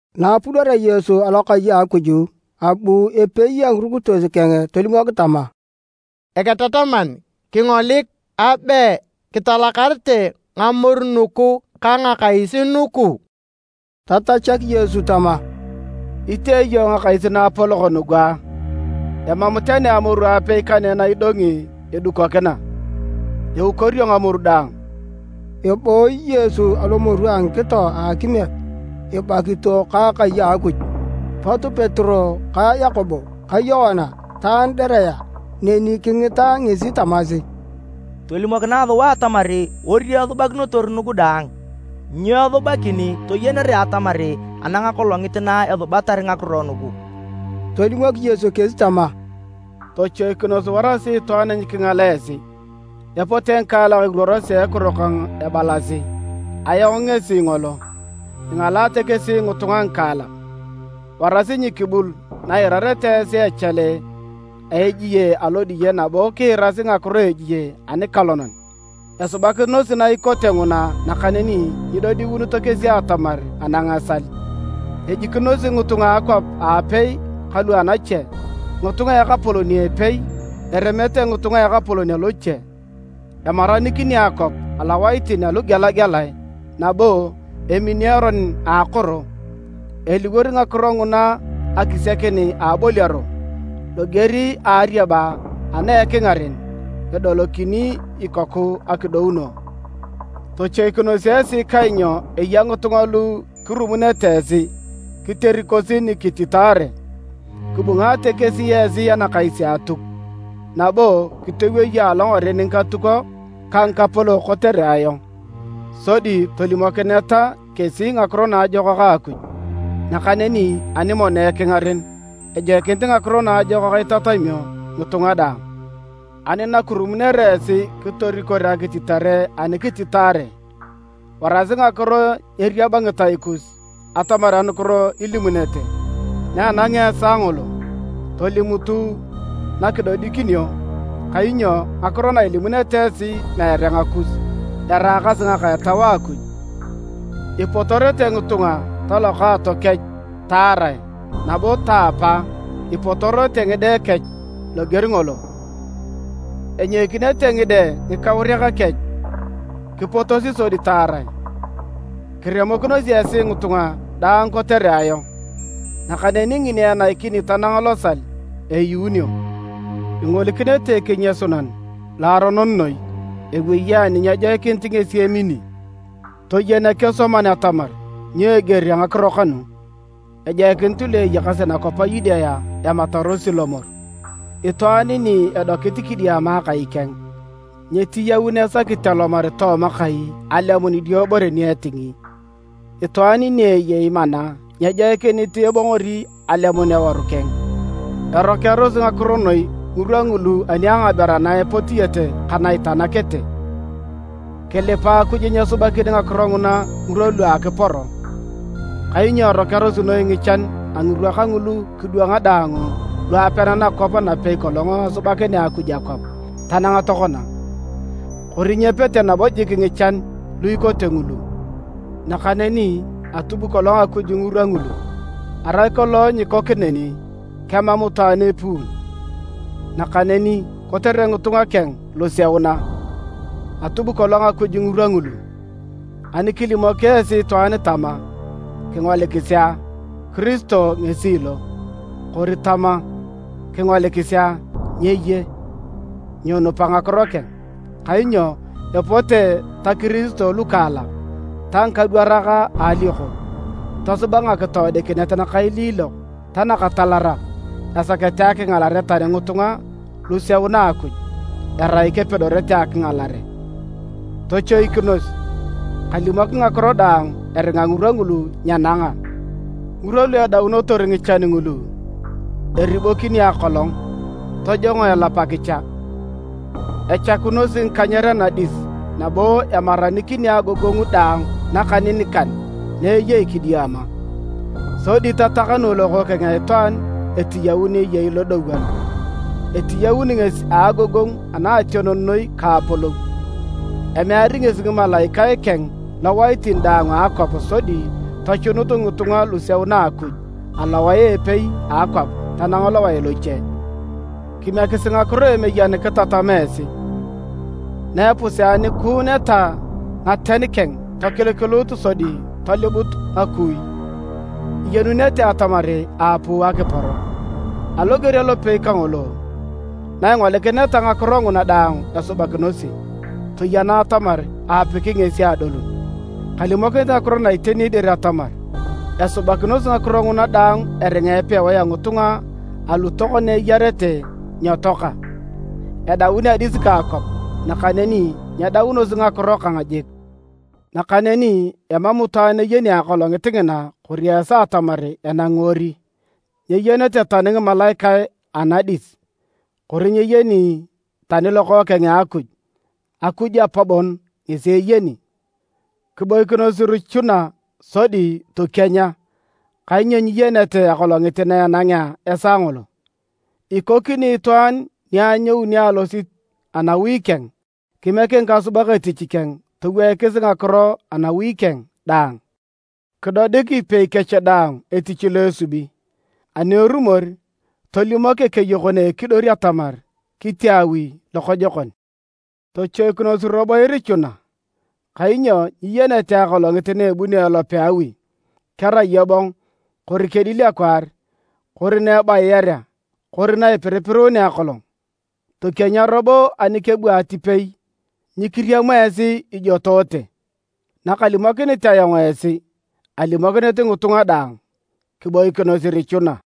Na apudorea Yesu alokai a Akuj, abu epei a ngirukitos keng tolimok tama, “Eketataman, kingolik a! Abe kitalakarete ngamoru nugu ka ngakais nugu!” Tatachak Yesu tama, “Itee iyong ngakais naapolok nugu a? Emam tani amoru apei kane na idongi edukokina, eukorio ngamoru daang.” Ebooyi Yesu alomoru a ngikito a akimiet ibakito ka akai a Akuj. Pot Petero ka Yakobo ka Yoana ta Andirea neni kingita ngesi tamasi, “Tolimokinae sua atamar ori esubakinotor nugu daang, nyo esubakin toyenere atamar anang akolongit na esubatar ngakiro nugu?” Tolimok Yesu kesi tama, “Tochoikinos warasi itwaan nyikingal esi. Epote ngikaalak iruorosi a ekiro kang ebalasi, ‘Ayong ngesi ngolo!’ Ingalaate kesi ngitunga ngikaalak. Warasi nyikibul na iirareta esi echale a ejie alodiye nabo kiirasi ngakiro a ejie anikalonan. Esubakinosi ngakiro na ikote nguna nakaneni nyidodiunito kesi atamar anang esal. Ejikinosi ngitunga a akwap aapei ka lu anache, ngitunga a ekapolon a epei, eremete ngitunga a ekapolon aloche. Emaranikini akwap alowaitin alugelagelae nabo emini eron a akoro. Eliwor ngakiro nguna akisiakin a aboliaro, loger a ariaba ana ekingaren edolokini ikoku akidouno. “Tochoikinos esi kainyo eya ngitunga lu kirumunete esi kiterikosi nikititaare. Kibungaate kesi esi anakais a Atuk nabo kitoweyo alongaren ngikatukok ka ngikapolok kotere ayong, sodi tolimokineta kesi Ngakiro Naajokak a Akuj. Nakaneni ani mono ekingaren, ejoikinit Ngakiro Naajokak itatamio ngitunga daang. Ani nakirumunere esi kitorikor akititare ani kititaare, warasi ngakiro nyeeriab ngitai kus atamar anukiro ilimunete. Na enangea esaa ngolo, tolimutu nakidodikinio. Kainyo ngakiro na ilimunete esi meere ngakus, eraakasi ngaka a Etau a Akuj. Ipotorete ngitunga talokaato kech taarae nabo taapa ipotorete ngide kech loger ngolo. Enyoikinete ngide ngikauriak kech kipotosi sodi taarae. Kiremokinosi esi ngitunga daang kotere ayong. Nakaneni ngini enaikini tanang losal, eyuunio. “Ingolikinete ‘Ekenyasunan Loaronon noi’ ewei ani nyejoikinit ngesi emini.” (Toyen ekesoman atamar: nyo eger a ngakiro kanu!) “Ejoikinit lu eyakasi nakwap a Yudea ematarosi lomor. Itwaan ni edokit kidiama akai keng, nyeetiyaun esakit alomar tooma kai alemun idiobore ni etingi. Itwaan ni eyei mana nyejoikinit ebongori alemun eworu keng. Erokearosi ngakiro noi ngirwa ngulu ani a ngaberu ana epotiete ka na itanakete! Kilipa Akuj nyeesubakin ngakiro nguna ngirwa lu a akiporo! Kainyo erokearosi noi ngichan a ngirwa kangulu kidwanga daang lu apean nakwap napei kolong asubakinea Akuj akwap tanang tokona. Kori nyepete nabo jik ngichan lu ikote ngulu. Nakaneni atub kolong Akuj ngirwa ngulu. Arai kolong nyiikok neni, kemam itwaan epuun. Nakaneni kotere ngitunga keng luseuna, atub kolong Akuj ngirwa ngulu. “Ani kilimok esi itwaan tama, ‘Kingolikisi a, Kiristo ngesi lo!’ Kori tama, ‘Kingolikisi a, nyeye!’ Nyinupa ngakiro keng. Kainyo epote ta Kiristo lukaliokok ta ngikadwarak a alioko, tosuba ngakitoodikinet nakailiilok ta nakatalarak esakete akingalare tani ngitunga luseuna a Akuj, erai kepedorete akingalare. Tochoikinos! Kalimok ngakiro daang eringa ngirwa ngulu nyenanga. “Ngirwa lu edaunotor ngichan ngulu, eribokini akolong, tojongo elap akicha. Echakunosi ngikanyer anadis nabo emaranikini agogongu daang nakaninikan na eyei kidiama. Sodi tatakanu Lokookeng a Itwaan etiyaun eyei lodowon, etiyaun ngesi a agogongu anaationon noi ka apolou. Emeari ngesi ngimalaikae keng lowaitin daang a akwap, sodi tochunut ngitunga luseuna a Akuj alowae a epei a akwap tanang lowae loche. “Kimiekisi ngakiro a emeyen kitatam esi. Na epuseakuuneta ngaten keng tokilikiluut sodi tolibut ngakui, iyenunete atamar aapuu akiporo. Aloger alopei kangolo, na ingolikineta ngakiro nguna daang esubakinosi, toyena atamar aapiki ngesi adolun. Kalimokinit ngakiro na iteni dir atamar esubakinosi ngakiro nguna daang eringa epewae a ngitunga alu tokona eyarete nyetoaka. Edaun adis ka akwap nakaneni nyedaunosi ngakiro kang jik. “Nakaneni emam itwaan eyeni akolongit ngina kori esaa atamar enangi ori, nyeyenete tani ngimalaikae anadis, kori nyeyeni tani Lokookeng a Akuj, Akuj Apa bon ngesi eyeni. Kiboikinos irichuna sodi tokienya kainyo nyiyenete akolongit na enangea esaa ngolo. Ikokini itwaan ni anyouni alosit anawi keng kimiek ngikasubak etich keng toweikis ngakiro anawi keng daang, kidodik ipei kech daang etich lo esubi. Ani erumor tolimok ekeyokon a ekidor atamar kitee awi lokojokon. Tochoikinos robo irichuna, kainyo nyiyenete akolongit na ebunio elope a awi, kerai ebong kori kedil akwaar kori na ebayiarea kori na ipiripiruunea akolong. Tokienya robo ani kebu atipei nyikiriam esi ijotoote. Nakalimokinit ayong esi, alimokinit ngitunga daang: Kiboikinos irichuna!”